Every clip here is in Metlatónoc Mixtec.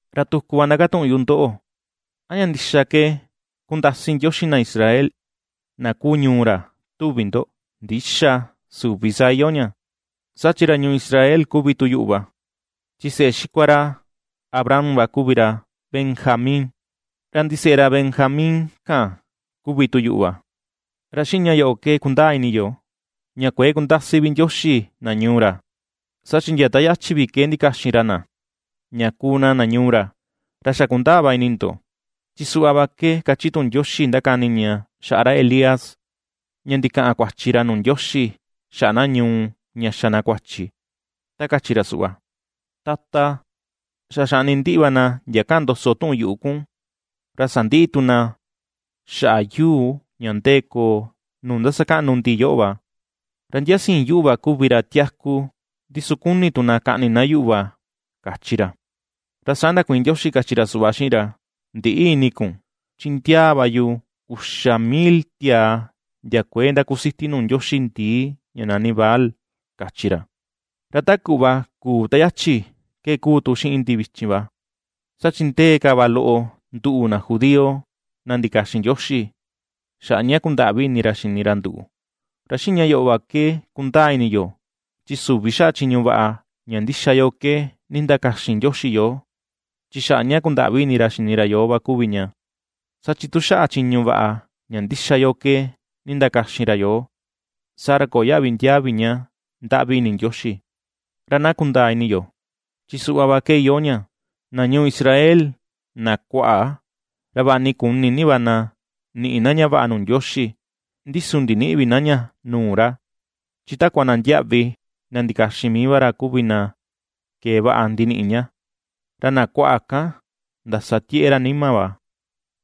Ra tuku va ndakatuꞌun yu ndoꞌo: ¿A ña ndixa ke kundasi Ndioxi na Israel, na kuu ñuu ra, tuvi ndo? ¡Ndïxa! ¡Süvi saa iyoo ña! Saa chi ra ñuu Israel kuvi tu yuꞌu va; chi seꞌe xikua ra Abraham va kuvi ra Benjamín, ra ndiseꞌe ra Benjamín kan kuvi tu yuꞌu va. Ra xiꞌin ña yoꞌo ke kundaa ini yo, ña kuëe kundasi vi Ndioxi na ñuu ra, saa chi ndia ta yachi vi ke ndikaxin ra na, ña kuu na na ñuu ra. Ra xa kundaa va ini ndo, chi suꞌva va ke ^kachi tuꞌun Ndioxi ndakani ña xaꞌa ra Elías, ña ndikaꞌan kuachi ra nuu Ndioxi xaꞌa na ñuu ña xa na kuachi, ta kachi ra suꞌva: “Tata, xa xaꞌni ndiꞌi va na ndia kaꞌan ndoso tuꞌun yuꞌu kun, ra sandiꞌi tu na xaꞌa yuu ña ndee koo, nuu ndasakaꞌnu ndi yoꞌo va, ra ndia siin yuꞌu va kuvi ra tiaku, ndi su kuni tu na kaꞌni na yuꞌu va”, kachi ra. Ra saa ndakuiin Ndioxi kachi ra suꞌva xiꞌin ra: “Ndïꞌi ini kun, chi ndiaa va yu uxa mil tiaa ndia kuëe ^ndakusiti nuu ndioxi ndii ña nani Baal”, kachi ra. Ra ta kuꞌva kuu ta yachi, ke ^kuu tu xiꞌin ndi vichin va, saa chi ndee ka va loꞌo, nduꞌu, na judío, na ndikaxin Ndioxi, xaꞌa ña kundaꞌvi ini ra xini ra nduꞌu. Ra xiꞌin ña yoꞌo va ke kundaa ini yo, chi süvi xaꞌa chiñu vaꞌa ña ndíxa yo ke nindakaxin Ndioxi yoo, chi xaꞌa ña kundaꞌvi ini ra xini ra yoo va kuvi ña; saa chi tu xaꞌa chiñu vaꞌa ña ndíxa yo ke nindakaxin ra yoo, saa ra köo yaꞌvi ndiaa vi ña ndaꞌvi ini Ndioxi. Ra na kundaa ini yo, chi suꞌva va ke iyoo ña: Na ñuu Israel, na kuaꞌa, ra vaꞌa ni kuni ni va na niꞌi na ña vaꞌa nuu Ndioxi, ndi su ndinïꞌi vi na ña nuu ra, chi takua na ndiaꞌvi na ndikaxin mii va ra kuvi na kee vaꞌa ndiniꞌi ña. Ra na kuaꞌa kan, ndasa tieꞌe ra nima va,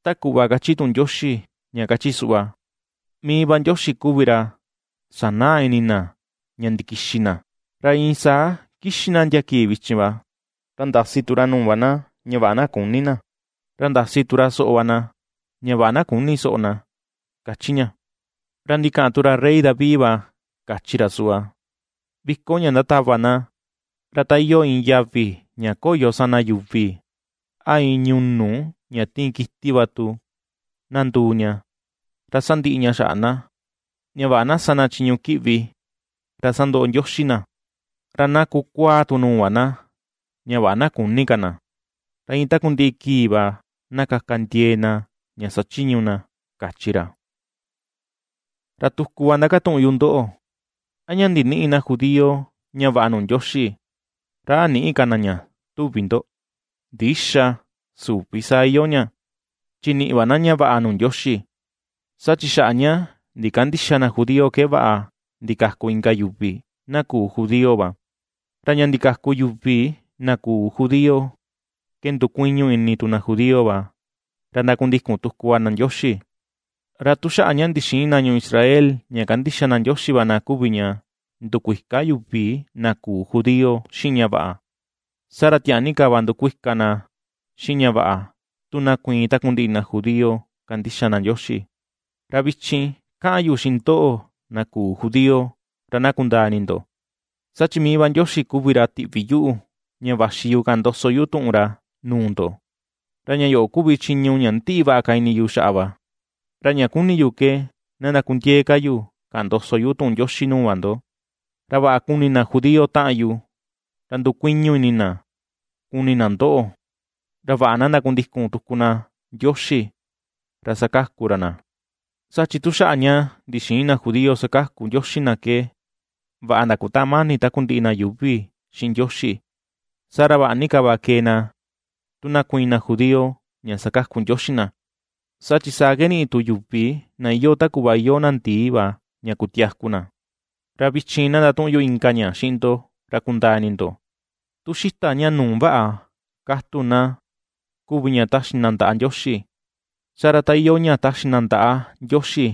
ta kuꞌva kachi tuꞌun Ndioxi, ña kachi suꞌva: “Mii va Ndioxi kuvi ra, sanaa ini na ña ndikixi na, ra iin saa kixi na ndia kii vichin va, ra ndasi tu ra nuu va na ña vaꞌa na küni na, ra ndasi tu ra soꞌo va na ña vaꞌa na küni soꞌo na”, ^kachi ña. Ra ndikaꞌan tu ra rey David va kachi ra suꞌva: Viko ña ndatava na, ra ta iyoo iin yavi ña koyo sana yuvi, a iin ñunu ña tiin kiti va tu, na nduu ña, ra sandiꞌi ña xaꞌa na, ña vaꞌa na sa na chiñu kiꞌvi, ra sandoꞌo Ndioxi na. Ra na kukuáá tu nuu va na, ña vaꞌa na küni ka na, ra iin takundiꞌi kii va, na kaka ndiee na ña sachiñu na, kachi ra. Ra tuku va ndakatuꞌun yu ndoꞌo: ¿A ña ndinïꞌi na judío ña vaꞌa nuu Ndioxi, ra a nïꞌi ka na ña, tuvi ndo? ¡Ndïxa, süvi saa iyoo ña! Chi niꞌi va na ña vaꞌa nuu Ndioxi, saa chi xaꞌa ña ndikandïxa na judío ke vaꞌa ndikaku inka yuvi, na küu judío va, ra ña ndikaku yuvi na küu judío ke ndukuiñu ini tu na judío va, ra ndakundikun tuku va na Ndioxi. Ra tu xaꞌa ña ndixïin na ñuu Israel ña kandixa na Ndioxi va na kuvi ña ndukuika yuvi na küu judío xiꞌin ña vaꞌa, saa ra tiaa ni ka va ndukuika na xiꞌin ña vaꞌa, tu na kuiin takundiꞌi na judío kandixa na Ndioxi. Ra vichin kaꞌan yu xiꞌin ndoꞌo, na küu judío, ra na kundaa ini ndo, saa chi mii va Ndioxi kuvi ra tiꞌvi yuꞌu, ña vaxi yu kaꞌan ndoso yu tuꞌun ra nuu ndo, ra ña yoꞌo kuvi chiñu ña ^ndiꞌi vaꞌa ka ini yu xaꞌa va. Ra ña ^kuni yu ke ndakundiee ka yu kaꞌan ndoso yu tuꞌun Ndioxi nuu va ndo, ra vaꞌa kuni na judío taꞌan yu, ra ndukuiñu ini na kuni na ndoꞌo, ra vaꞌa na ndakundikun tuku na Ndioxi, ra sakaku ra na. Saa chi tu xaꞌa ña ndixïin na judío sakaku Ndioxi na ke vaꞌa ndakutaꞌan mani takundiꞌi na yuuvi xiꞌin Ndioxi. Saa ra, vaꞌa ni ka va kee na tu na kuiin na judío ña sakaku Ndioxi na, saa chi saa ke niꞌi tu yuvi na iyoo ta kuꞌva iyoo na ndii va ña kutiaku na. Ra vichin na ndatuꞌun yu inka ña xiꞌin ndo, ra kundaa ini ndo. Tu xita ña nuu vaꞌa katu na kuvi ña taxi na ndaꞌa Ndioxi, saa ra ta iyoo ña taxi na ndaꞌa Ndioxi,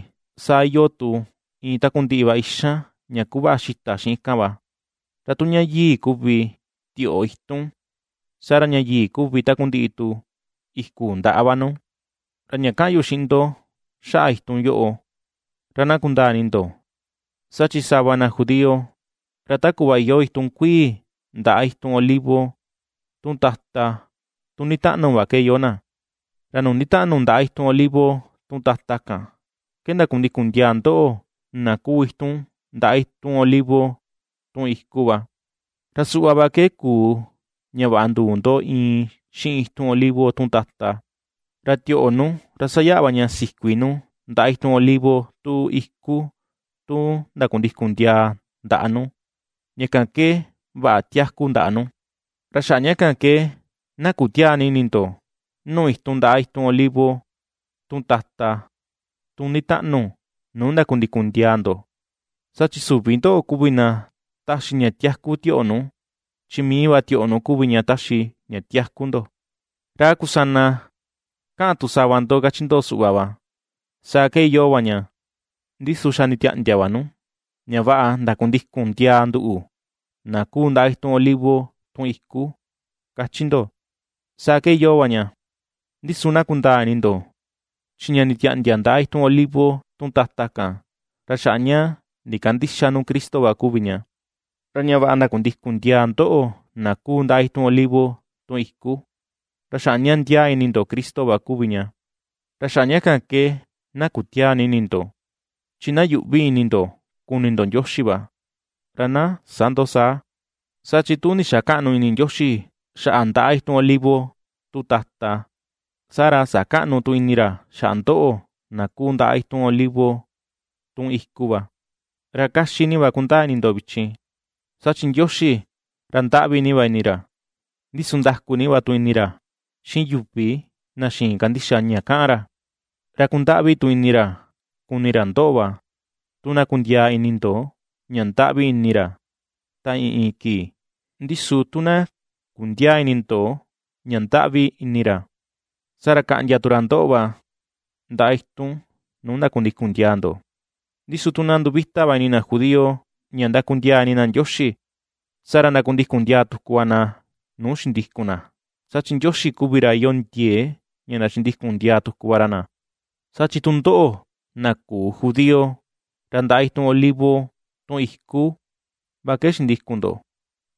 saa iyoo tu iin takundiꞌi va ixan ña kuvaꞌa xita xiꞌin kan va. Ra tu ña yii kuvi tioꞌo itun, saa ra ña yii kuvi takundiꞌi tu iku ndaꞌa va nu. Ra ña kaꞌan yu xiꞌin ndo xaꞌa itun yoꞌo, ra na kundaa ini ndo, saa chi sava na judío, ra ta kuꞌva iyoo itun kuii ndaꞌa itun olivo, tun tata, tun nditaꞌnu va ke iyoo na; ra nuu nditaꞌnu ndaꞌa itun olivo, tun tata kan, ke ndakundikun ndiaa ndoꞌo na kuu itun ndaꞌa itun olivo, tun iku va. Ra suꞌva va ke kuu ña vaꞌa nduu ndo iin xiꞌin itun olivo, tun tata, ra tioꞌo nu ra sayaꞌa va ña sikuii nu ndaꞌa itun olivo, tun iku, tun ndakundikun ndiaa ndaꞌa nu, ña kan ke vaꞌa tiaku ndaꞌa nu. Ra xaꞌa ña kan ke na kutiäa ni ini ndo, nuu itun ndaꞌa itun olivo, tun tata, tun nditaꞌnu, nuu ndakundikun ndiaa ndo, saa chi süvi ndoꞌo kuvi na ^taxi ña tiaku tioꞌo nu, chi mii va tioꞌo nu kuvi ña taxi ña tiaku ndo. Ra a kusana kaꞌan tu sava ndo, kachi ndo suꞌva va: “Saa ke iyoo va ña, ndi su xa nditiaꞌndia va nu, ña vaꞌa ndakundikun ndiaa nduꞌu, na kuu ndaꞌa itun olivo, tun iku”, kachi ndo. Saa ke iyoo va ña, ndi su na kundaa ini ndo, chi ña nditiaꞌndia ndaꞌa itun olivo, tun tata kan, ra xaꞌa ña ndikandïxa nu Cristo va kuvi ña, ra ña vaꞌa ndakundikun ndiaa ndoꞌo na kuu ndaꞌa itun olivo, tun iku, ra xaꞌa ña ndiaa ini ndo Cristo va kuvi ña. Ra xaꞌa ña kan ke na kutiäa ni ini ndo, chi na yuꞌvi ini ndo kuni ndo Ndioxi va, ra na sä ndo saa. Saa chi tu ndixakäꞌnu ini Ndioxi xaꞌa ndaꞌa itun olivo, tun tata, saa ra sakäꞌnu tu ini ra xaꞌa ndoꞌo, na kuu ndaꞌa itun olivo, tun iku va. Ra ^kaxi ni va na kundaa ini ndo vichin, saa chi Ndioxi ra ndaꞌvi ni va ini ra, ndi su ndaku ni va tu ini ra xiꞌin yuvi na xïin kandixa ña kaꞌan ra; ra kundaꞌvi tu ini ra kuni ra ndoꞌo va, tu na kundiaa ini ndo ña ndaꞌvi ini ra ta iin iin kii. Ndi su tu na kundiäa ini ndo, ña ndaꞌvi ini ra, saa ra kaꞌndia tu ra ndoꞌo va, ndaꞌa itun nuu ndakundikun ndiaa ndo. Ndi su tu na nduvita va ini na judío ña ndakundiaa ini na Ndioxi, saa ra ndakundikun ndiaa tuku va na nuu xindikun na; saa chi Ndioxi kuvi ra iyoo ndiee ña ndachindikun ndiaa tuku va ra na. Saa chi tu ndoꞌo, na küu judío, ra ndaꞌa itun olivo, tun iku, va ke xikuu ndo,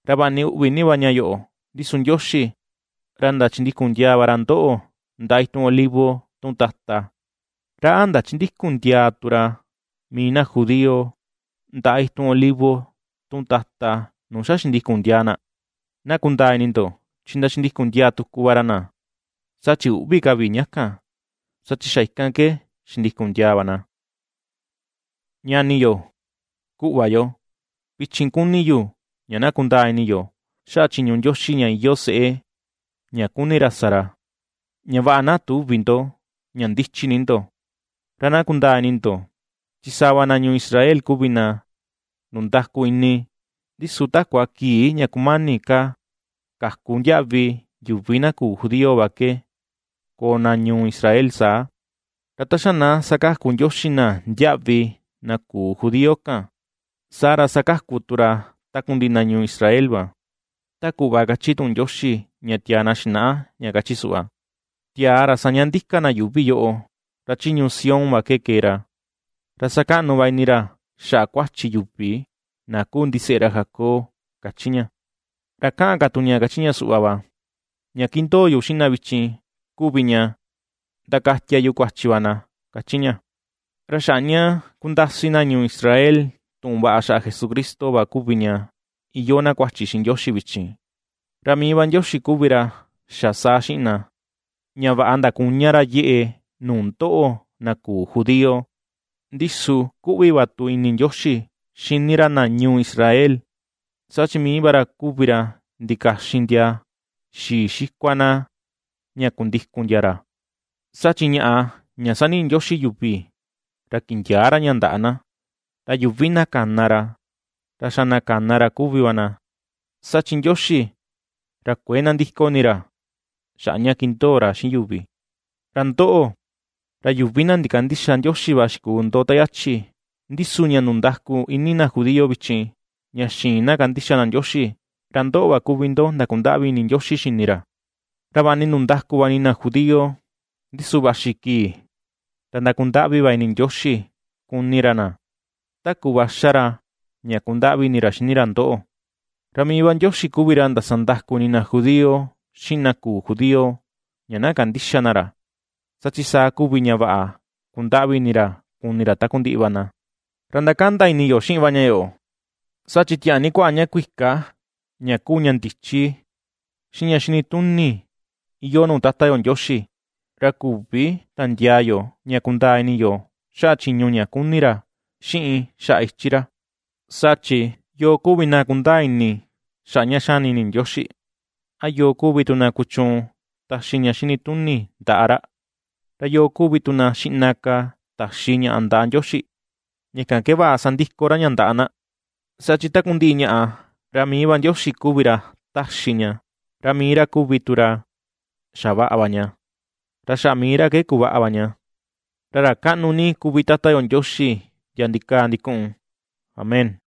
ra vaꞌa ni uꞌvi ni va ña yoꞌo, ndi su Ndioxi, ra ndachindikun ndiaa va ra ndoꞌo, ndaꞌa itun olivo, tun tata. ¿Ra a ndachindïkun ndiaa tu ra mii na judío, ndaꞌa itun olivo, tun tata, nuu xa xindikun ndiaa na? Na kundaa ini ndo, chi ndachindikun ndiaa tuku va ra na, saa chi üꞌvi ka vi ña kan, saa chi xa ikan ke xindikun ndiaa va na. Ñani yo, kuꞌva yo, vichin kuni yu ña na kundaa ini yo xaꞌa chiñu Ndioxi ña iyoo seꞌe ña kuni ra sa ra, ña vaꞌa na tüvi ndo ña ndichi ni ndo; ra na kundaa ini ndo, chi sava va na ñuu Israel kuvi na ndundaku ini, ndi su takua kii ña kumani ka kaku ndiaꞌvi yuvi na küu judío va ke koo na ñuu Israel saa. Ra ta xa na sakaku Ndioxi na ndiaꞌvi na küu judío kan, saa ra sakaku tu ra takundiꞌi na ñuu Israel va, ta kuꞌva kachi tuꞌun Ndioxi ña tiaa na xinaꞌa, ña kachi suꞌva: Tiaa ra saña ndika na yuuvi yoꞌo, ra chi ñuu Sión va ke kee ra, ra sakaꞌnu va ini ra xaꞌa kuachi yuvi na kuu ndiseꞌe ra Jacob, ^kachi ña. Ra ^kaꞌan ka tu ña kachi ña suꞌva va: Ña ^kindoo yu xiꞌin na vichin kuvi ña, ndakatia yu kuachi va na, ^kachi ña. Ra xaꞌa ña ^kundasi na ñuu Israel tuꞌun vaꞌa xaꞌa Jesucristo va kuvi ña iyoo na kuachi xiꞌin Ndioxi vichin; ra mii va Ndioxi kuvi ra xa saa xiꞌin na, ña vaꞌa ndakuña ra yeꞌe nuu ndoꞌo na küu judío. Ndi su kuꞌvi va tu ini Ndioxi xini ra na ñuu Israel, saa chi mii va ra kuvi ra ndikaxin ndia xii xikua na ña kundikun ndia ra. Saa chi ñaꞌa ña ^saniꞌi Ndioxi yuvi, ra kindiäa ra ña ndaꞌa na, ra yuvi na kana ra, ra xa na kana ra kuvi va na, saa chi Ndioxi ra kuëe nandiko ini ra xaꞌa ña kindoo ra xiꞌin yuvi. Ra ndoꞌo, ra yuvi na ndikandïxa Ndioxi va xikuu ndo ta yachi, ndi su ña ndundaku ini na judío vichin ña xïin na kandixa na Ndioxi, ra ndoꞌo va kuvi ndo ndakundaꞌvi ini Ndioxi xini ra. Ra vaꞌa ni ndundaku va ini na judío, ndi su vaxi kii ra ndakundaꞌvi va ini Ndioxi kuni ra na, ta kuꞌva ^xa ra ña ^kundaꞌvi ini ra xini ra ndoꞌo. Ra mii va Ndioxi kuvi ra ndasa ndaku ini na judío, xiꞌin na küu judío ña na kandïxa na ra, saa chi saa kuvi ña vaꞌa kundaꞌvi ini ra kuni ra takundiꞌi va na. ¡Ra ndakanda ini yo xiꞌin ña yoꞌo sa chi tiaa ni kuaꞌa ña kuika ña kuu ña ndichi, xiꞌin ña xini tuni iyoo nuu Tata yo Ndioxi! ¡Ra küvi tandiaa yo ña kundaa ini yo xaꞌa chiñu ña kuni ra, xiꞌin xaꞌa ichi ra! Saa chi “¿yoo kuvi na kundaa ini xaꞌa ña xani ini Ndioxi? A ¿yoo kuvi tu na kuchuun taxi ña xini tuni ndaꞌa ra? ¿Ra yoo kuvi tu na xiꞌna ka taxi ñaꞌa ndaꞌa Ndioxi, ña kan ke vaꞌa sandiko ra ña ndaꞌa na?” Saa chi takundiꞌi ñaꞌa, ra mii va Ndioxi kuvi ra ^taxi ña, ra mii ra kuvi tu ra xavaꞌa va ña, ra xaꞌa mii ra ke kuvaꞌa va ña. ¡Ra ra kaꞌnu ni kuvi Tata yo Ndioxi ndia ndikaa ndikuꞌun! Amén.